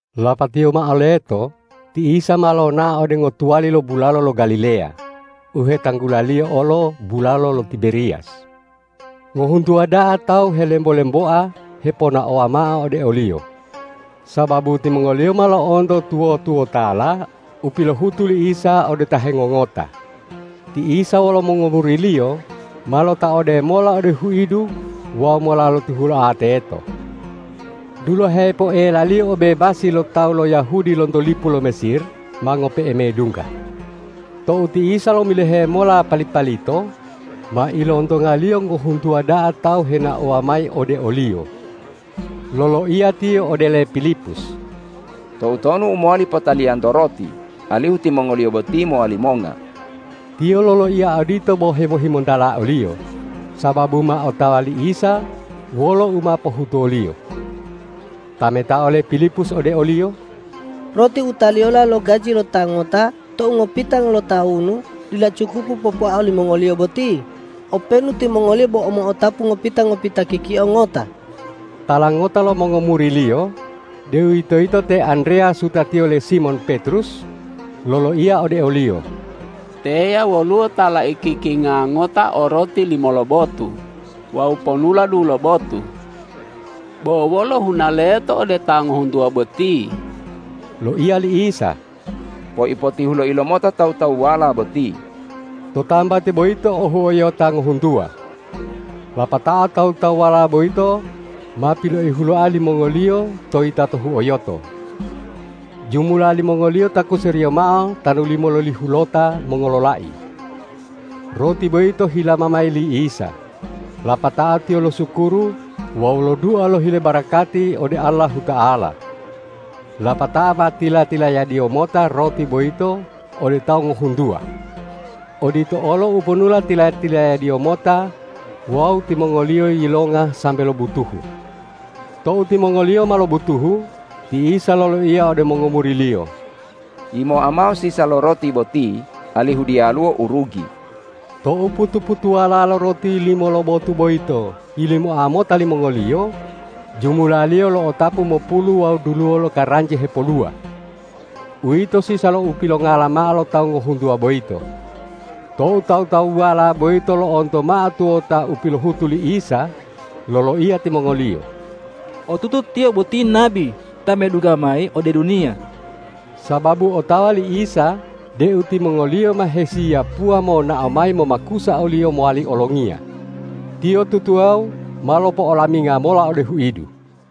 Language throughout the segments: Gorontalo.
Lapatiyo mao leto ti Isa ma lonao ode ngotuwali lo bulalo lo Galileya, u hetanggulaliyo olo bulalo lo Tiberiyas. Ngohuntuwa da'a tawu helembo-lemboa heponaowa mao ode o-Liyo, sababu timongoliyo ma lo'onto tuwo-tuwotala u pilohutu li Isa ode ta hengongota. Ti Isa wolo mongomuri-Liyo ma lotaode mola ode huidu wawu mola lotihuloa teto. Dulahe poelaliyo obebasi lo tawu lo Yahudi lonto lipu lo Mesir ma ngope'e medungga. Tou ti Isa lomilohe mota pali-palito, ma ilontonga-Liyo ngohuntuwa da'a tawu henaowa mayi ode o-Liyo. Loloiya Tiyo ode le Pilipus,”Toutonu u mowali potaliyanto roti, alihu timongoliyo boti mowali monga?” Tiyo loloiya odito bo hemohimontala oliyo, sababu ma otawa li Isa wolo u ma pohutuwo-Liyo. Tametao le Pilipus ode o-Liyo,”Roti u taliyola lo gaji lo ta ngota tou ngopitango tawunu dila cukupu popoa olimongoliyo boti, openu timongoliyo bo mo'otapu ngopita-ngopita kikio ngota.” Tala ngota lo mongomuri-Liyo, deuwitoyito te Andreyas wutatiyo le Simon Petrus, loloiya ode o-Liyo, ”Teya woluwo ta laikikinga ngota o roti limo lobotu wawu ponula dulobotu. Bo wolo huna leto ode ta ngohuntuwa boti?” Loiya li Isa,”Poipotihuloi lomota tawu-tawuwala boti.” To tambati boyito o huyo'ota ngohuntuwa. Lapatao tawu-tawuwala boyito ma piloihuloa limongoliyo to yitato huyo'oto. Jumula limongoliyo takuseriyo mao tanu limololihulota mongololai. Roti boyito hilama mayi li Isa, lapatao Tiyo losukuru wawu lodua lohile barakati ode Allahuta'ala. Lapatao ma tila-tilayad-Iyo mota roti boyito ode tawu ngohuntuwa. Odito olo uponula tila-tilayad-Iyo mota wawu timongoliyo yilonga sambe lobutuhu. Tou timongoliyo ma lobutuhu, ti Isa loloiya ode mongomuri-Liyo,”Yimoa mao sisa lo roti boti alihu diyaluwo u rugi.” Tou putu-putuwala lo roti limo lobotu boyito yilimoa mota limongoliyo, jumulaliyo lo'otapu mopulu wawu duluwo lokaranji hepoluwa. Uwito sisa lo upilongala mao lo tawu ngohuntuwa boyito. Tou tawu-tawuwala boyito lo'onto mao tuwota u pilohutu li Isa, loloiya timongoliyo,”Otutu Tiyo boti nabi ta medungga mayi ode duniya.” Sababu otawa li Isa deu timongoliyo ma hesiyapuwa monao mayi momakusa o-Liyo mowali olongiya, Tiyo tutuwawu ma lopo'olaminga mola ode huidu.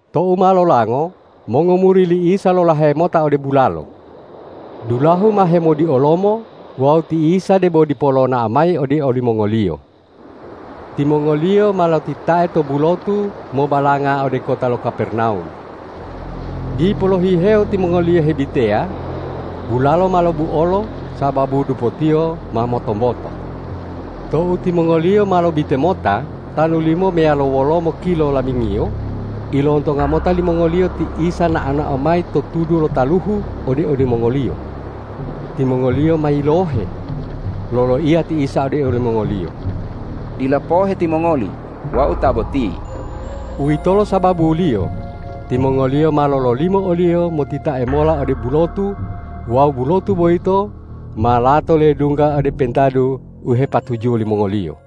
Tou ma lolango mongomuri li Isa lolahe mota ode bulalo. Dulahu ma hemodiolomo wawu ti Isa debo dipo lonao mayi ode olimongoliyo. Timongoliyo ma lotitae to bulotu mobalanga ode kota lo Kapernawum. Dipo lohihewo timongoliyo hebiteya, bulalo ma lobuolo sababu dupotiyo ma motomboto. Tou timongoliyo ma lobite mota tanu limo meyalo wolomo kilo lamingiyo, ilontonga mota limongoliyo ti Isa nao-nao mayi to tudu lo taluhu ode olimongoliyo. Timongoliyo ma yilohe. Loloiya ti Isa ode olimongoliyo,”Dila pohe timongoli, Wau ta boti!” Uwitolo sababuliyo timongoliyo ma lololimo o-Liyo motitae mola ode bulotu wawu bulotu boyito ma lato ledungga ode pentadu u hepatujuwo limongoliyo.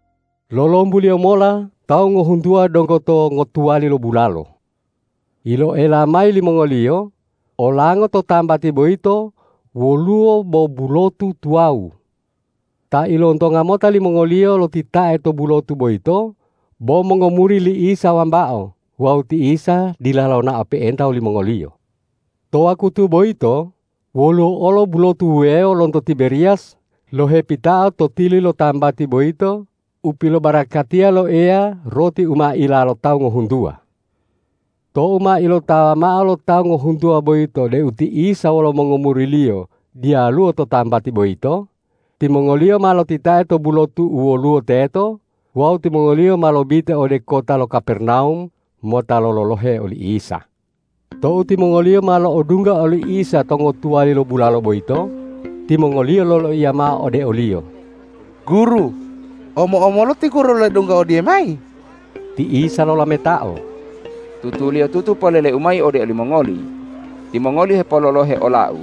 Lolombuliyo mola tawu ngohuntuwa donggo to ngotuwali lo bulalo. Iloela mayi limongoliyo, olango to tambati boyito woluwo bo bulotu tuwawu. Ta ilontonga mota limongoliyo lotitae to bulotu boyito bo mongomuri li Isa wambao wawu ti Isa dila lonao pe'enta wolimongoliyo. To wakutu boyito woluwo olo bulotu wuwewo lonto Tiberiyas lohepitao to tili lo tambati boyito u pilobarakatiya lo Eya roti u ma ila lo tawu ngohuntuwa. Tou ma ilotawa mao lo tawu ngohuntuwa boyito deu ti Isa wolo mongomuri-Liyo diyaluwo to tambati boyito, timongoliyo ma lotitae to bulotu u woluwo teto wawu timongoliyo ma lobite ode kota lo Kapernawum mota lololohe oli Isa. Tou timongoliyo ma lo'odungga oli Isa to ngotuwali lo bulalo boyito, timongoliyo loloiya mao ode o-Liyo,”Guru, omo-omolu ti Guru ledungga odiyamayi?” Ti Isa lolametao,”Tutuliyotutu polele-U mayi ode olimongoli: Timongoli hepololohe ola-U,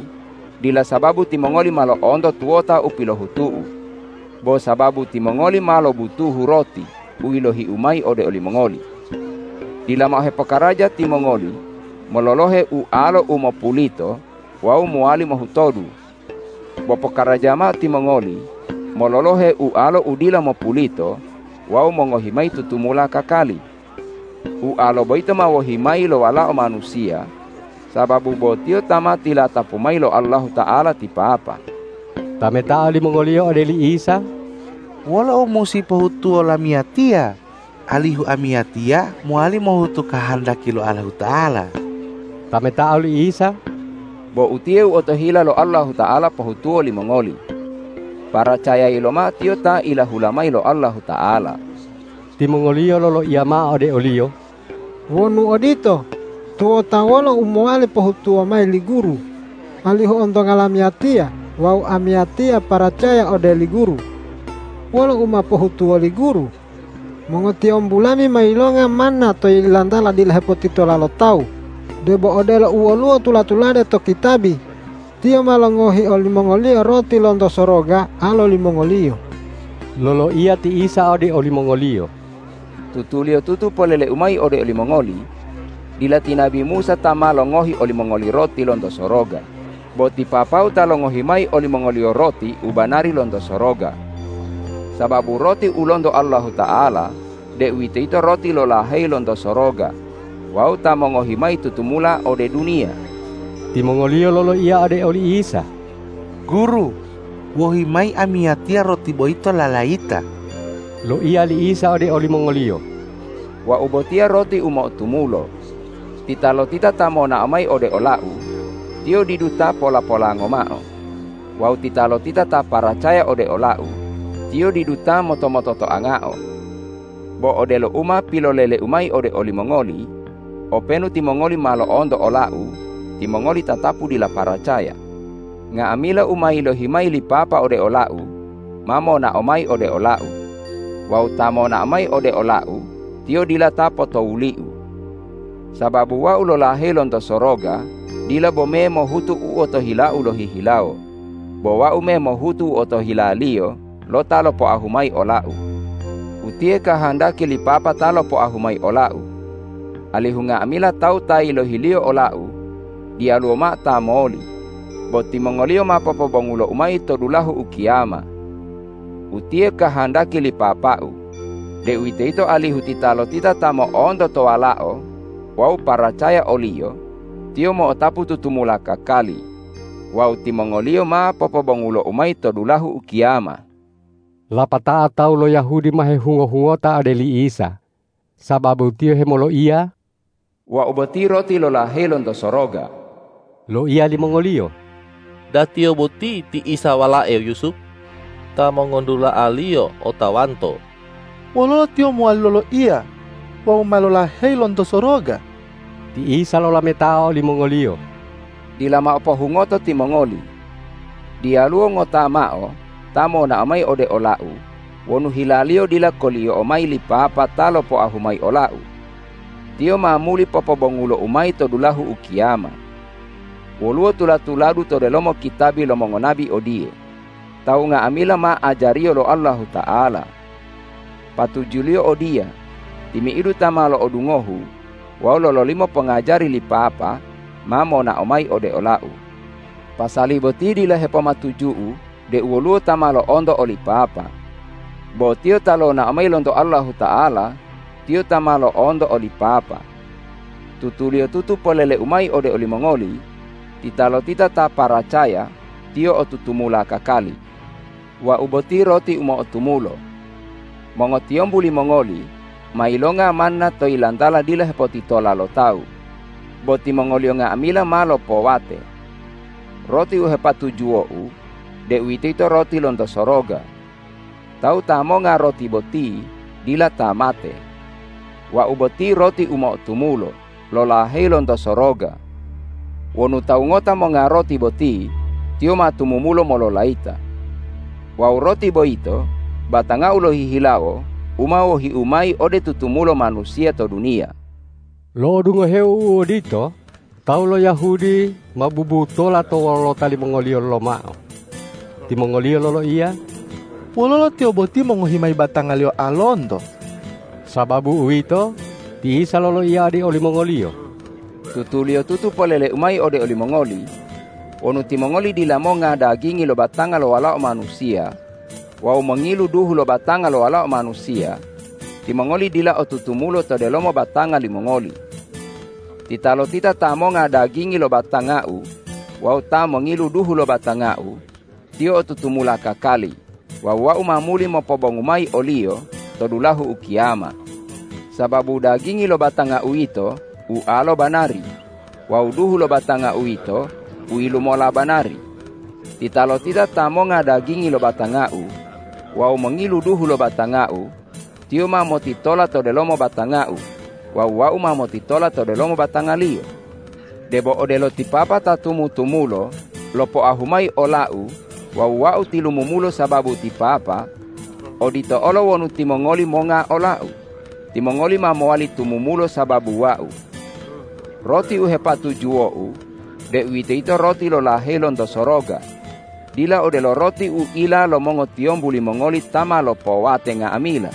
dila sababu timongoli ma lo'onto tuwota u pilohutu-U, bo sababu timongoli ma lobutuhu roti u yilohi-U mayi ode olimongoli. Dila mao hepokaraja timongoli mololohe ualo u mopulito wawu mowali mohutodu. Bo pokaraja mao timongoli mololohe ualo u dila mopulito wawu mongohi mayi tutumula kakali. Ualo boyito ma wohi mayi lo Walao Manusiya, sababu bo Tiyo ta ma tilatapu mayi lo Allahuta'ala ti Papa.” Tametao limongoliyo ode li Isa,”Wolo u musi pohutuwo lamiyatiya, alihu amiyatiya mowali mohutu kahandaki lo Allahuta'ala?” Tametao li Isa,”Bo utiye u otohila lo Allahuta'ala pohutuwo limongoli: Paracayayi lomao Tiyo ta ilahula mayi lo Allahuta'ala.” Timongoliyo loloiya mao ode o-Liyo,”Wonu odito, tuwota wolo u mowali pohutuwo mayi li Guru, alihu ontonga lamiyatiya wawu amiyatiya paracaya ode li Guru? Wolo u ma pohutuwo li Guru? Mongotiyombu lami ma yilonga manna to yilantala dila hepotitola lo tawu, debo odelo u woluwo tula-tulade to kitabi, ’Tiyo ma longohi olimongoliyo roti lonto soroga alo limongoliyo.’” Loloiya ti Isa ode olimongoliyo,”Tutuliyotutu polele-U mayi ode olimongoli: Dila ti nabi Musa ta ma longohi olimongoliyo roti lonto soroga, bo ti Papa-U ta longohi mayi olimongoliyo roti u banari lonto soroga. Sababu roti u lonto Allahuta'ala, deuwitoyito roti lolaheyi lonto soroga wawu ta mongohi mayi tutumula ode duniya.” Timongoliyo loloiya ode oli Isa,”Guru, wohi mayi amiyatiya roti boyito lalayita.” Loiya li Isa ode olimongoliyo,”Wau botiya roti u mo'otumulo. Titalotita ta monao mayi ode ola-U, tiyo didu ta pola-polango mao; wawu titalotita ta paracaya ode ola-U, tiyo didu ta moto- mototoangao. Bo odelo u ma pilolele-U mayi ode olimongoli, openu timongoli ma lo'onto ola-U, timongoli tatapu dila paracaya. Nga'amila u ma yilohi mayi li Papa ode ola-U, ma monao mayi ode ola-U; wawu ta monao mayi ode ola-U, tiyo dila ta potowuli-U. Sababu Wau lolaheyi lonto soroga dila bome mohutu u otohila-U lohihilawo, bo Wau me mohutu u otohila-Liyo lo ta lopoahu mayi ola-U. Utiye kahandaki li Papa ta lopoahu mayi ola-U, alihu nga'amila tawu ta yilohi-Liyo ola-U diyaluwo mao ta moli, bo timongoliyo ma popobongulo-U mayi to dulahu ukiyama. Utiye kahandaki li Papa-U, deuwitoyito alihu titalotita ta mo'onto to Walao wawu paracaya o-Liyo, tiyo mo'otapu tutumula kakali wawu timongoliyo ma popobongulo-U mayi to dulahu ukiyama.” Lapatao tawu lo Yahudi ma hehungo-hungota ode li Isa, sababu Tiyo hemoloiya,”Wau boti roti lolaheyi lonto soroga.” Loiya limongoliyo,”Da Tiyo boti ti Isa walae Yusup? Ta mongodula'a-Liyo otawanto! Wololo Tiyo mowali moloiya, ’Wau ma lolaheyi lonto soroga?’” Ti Isa lolametao olimongoliyo,”Dila mao pohungoto timongoli. Diyaluwo ngota mao ta monao mayi ode ola-U wonu hilaliyo dila koliyo'o mayi li Papa ta lopoahu mayi ola-U. Tiyo ma muli popobongulo-U mayi to dulahu ukiyama. Woluwo tula-tuladu to delomo kitabi lo mongonabi odiye, ’Tawu nga'amila ma ajariyo lo Allahuta'ala.’ Patujuliyo odiya, timi'idu ta ma lo'odungohu wawu lololimo pongajari li Papa, ma monao mayi ode ola-U. Pasali boti dila hepomatuju-U deu woluwo ta ma lo'onto oli Papa. Bo Tiyo ta lonao mayi lonto Allahuta'ala, Tiyo ta ma lo'onto oli Papa. Tutuliyotutu polele-U mayi ode olimongoli: Titalotita ta paracaya, tiyo o tutumula kakali. Wau boti roti u mo'otumulo. Mongotiyombu limongoli ma yilonga manna to yilantala dila hepotitola lo tawu, bo timongoliyo nga'amila ma lopowate. Roti u hepatujuwo-U, deuwitoyito roti lonto soroga. Tawu ta monga roti boti dila ta mate. Wau boti roti u mo'otumulo lolaheyi lonto soroga. Wonu tawu ngota monga roti boti, tiyo ma tumumulo mololayita. Wawu roti boyito batanga-U lohihilawo u ma wohi-U mayi ode tutumulo manusiya to duniya.” Lo'odungoheo u odito, tawu lo Yahudi ma bubutola to wolota limongoliyo lomao. Timongoliyo loloiya,”Wololo Tiyo boti mongohi mayi batanga-Liyo alonto?” Sababu uwito, ti Isa loloiya ode olimongoliyo,”Tutuliyotutu polele-U mayi ode olimongoli: Wonu timongoli dila monga dagingi lo batanga lo Walao Manusiya wawu mongilu duhu lo batanga lo Walao Manusiya, timongoli dila o tutumulo to delomo batanga limongoli. Titalotita ta monga dagingi lo batanga-U wawu ta mongilu duhu lo batanga-U, tiyo o tutumula kakali wawu Wau ma muli mopobongu mayi oliyo to dulahu ukiyama. Sababu dagingi lo batanga-U yito ualo banari wawu duhu lo batanga-U yito uyilumola banari. Titalotita ta monga dagingi lo batanga-U wawu mongilu duhu lo batanga-U, tiyo ma motitola to delomo batanga-U wawu Wau ma motitola to delomo batangaliyo. Debo odelo ti Papa ta tumutumulo lopoahu mayi ola-U wawu Wau tilumumulo sababu ti Papa; odito olo wonu timongoli monga ola-U, timongoli ma mowali tumumulo sababu Wau. Roti u hepatujuwo-U, deuwitoyito roti lolaheyi lonto soroga, dila odelo roti u ila lo mongotiyombu limongoli ta ma lopowate nga'amila.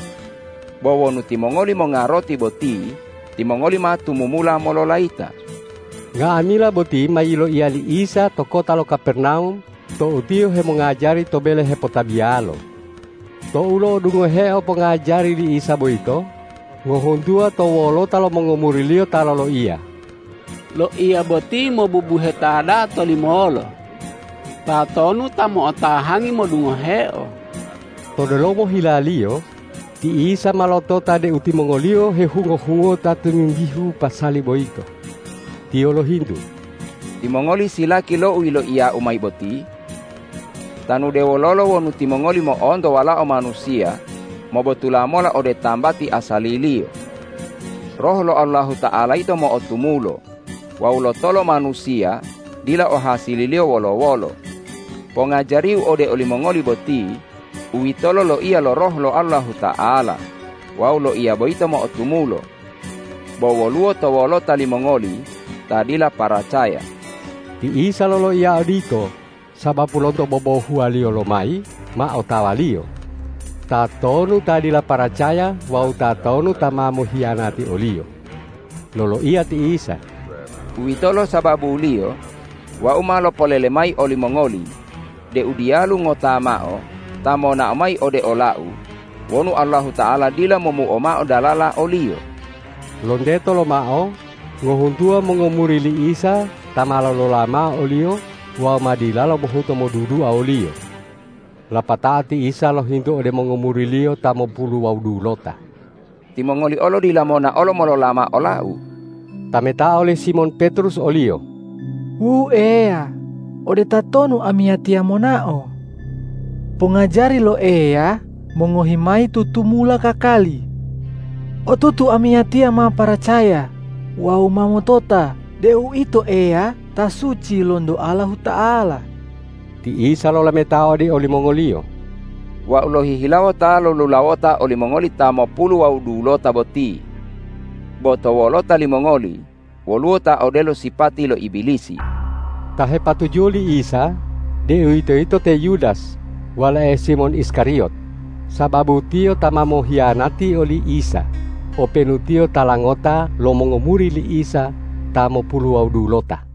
Bo wonu timongoli monga roti boti, timongoli ma tumumula mololayita.” Nga'amila boti ma yiloiya li Isa to kota lo Kapernawum tou Tiyo hemongajari to bele hepotabiyalo. Tou lo'odungoheo pongajari li Isa boyito, ngohuntuwa to wolota lo mongomuri-Liyo ta loloiya,”Loiya boti mobubuheta da'a tolimolo. Tatonu ta mo'otahangi modungoheo?” To delomo hila-Liyo, ti Isa ma lotota deu timongoliyo hehungo-hungota tomimbihu pasali boyito. Tiyo lohintu,”Timongoli silaki lo u yiloiya-U mayi boti? Tanu de wololo wonu timongoli mo'onto Walao Manusiya mobotula mola ode tambati asali-Liyo? Roh lo Allahuta'ala yito mo'otumulo wawu lotolo manusiya dila o hasililiyo wolo-wolo. Pongajari-U ode olimongoli boti, uwitolo loiya lo Roh lo Allahuta'ala wawu loiya boyito mo'otumulo. Bo woluwo to wolota limongoli ta dila paracaya.” Ti Isa loloiya odito sababu lonto bobohuwaliyo lomayi ma otawa-Liyo, tatonu ta dila paracaya wawu tatonu ta ma mohiyanati o-Liyo. Loloiya ti Isa,”Uwitolo sababuliyo Wau ma lopolele mayi olimongoli deu diyalu ngota mao ta monao mayi ode ola-U wonu Allahuta'ala dila momuo mao dalala oliyo.” Lonteto lomao ngohuntuwa mongomuri li Isa ta ma lolola mao o-Liyo wawu ma dilalo mohuto modudua o-Liyo. Lapatao ti Isa lohintu ode mongomuri-Liyo ta mopulu wawu dulota,”Timongoli olo dila monaolo, molola mao ola-U?” Tametao le Simon Petrus o-Liyo,”Wu Eya, ode tatonu amiyatiya monao? Pongajari lo Eya mongohi mayi tutumula kakali. Otutu amiyatiya ma paracaya wawu ma motota deu Ito Eya ta suci lonto Allahuta'ala.” Ti Isa lolametao ode olimongoliyo,”Wau lohihilawo ta lolulawota olimongoli ta mopulu wawu dulota boti. Bo to wolota limongoli woluwo ta odelo sipati lo Ibilisi!” Ta hepatujuwo li Isa, deuwitoyito te Yudas walae Simon Iskariyot, sababu tiyo ta ma mohiyanati oli Isa openu tiyo tala ngota lo mongomuri li Isa ta mopulu wawu dulota.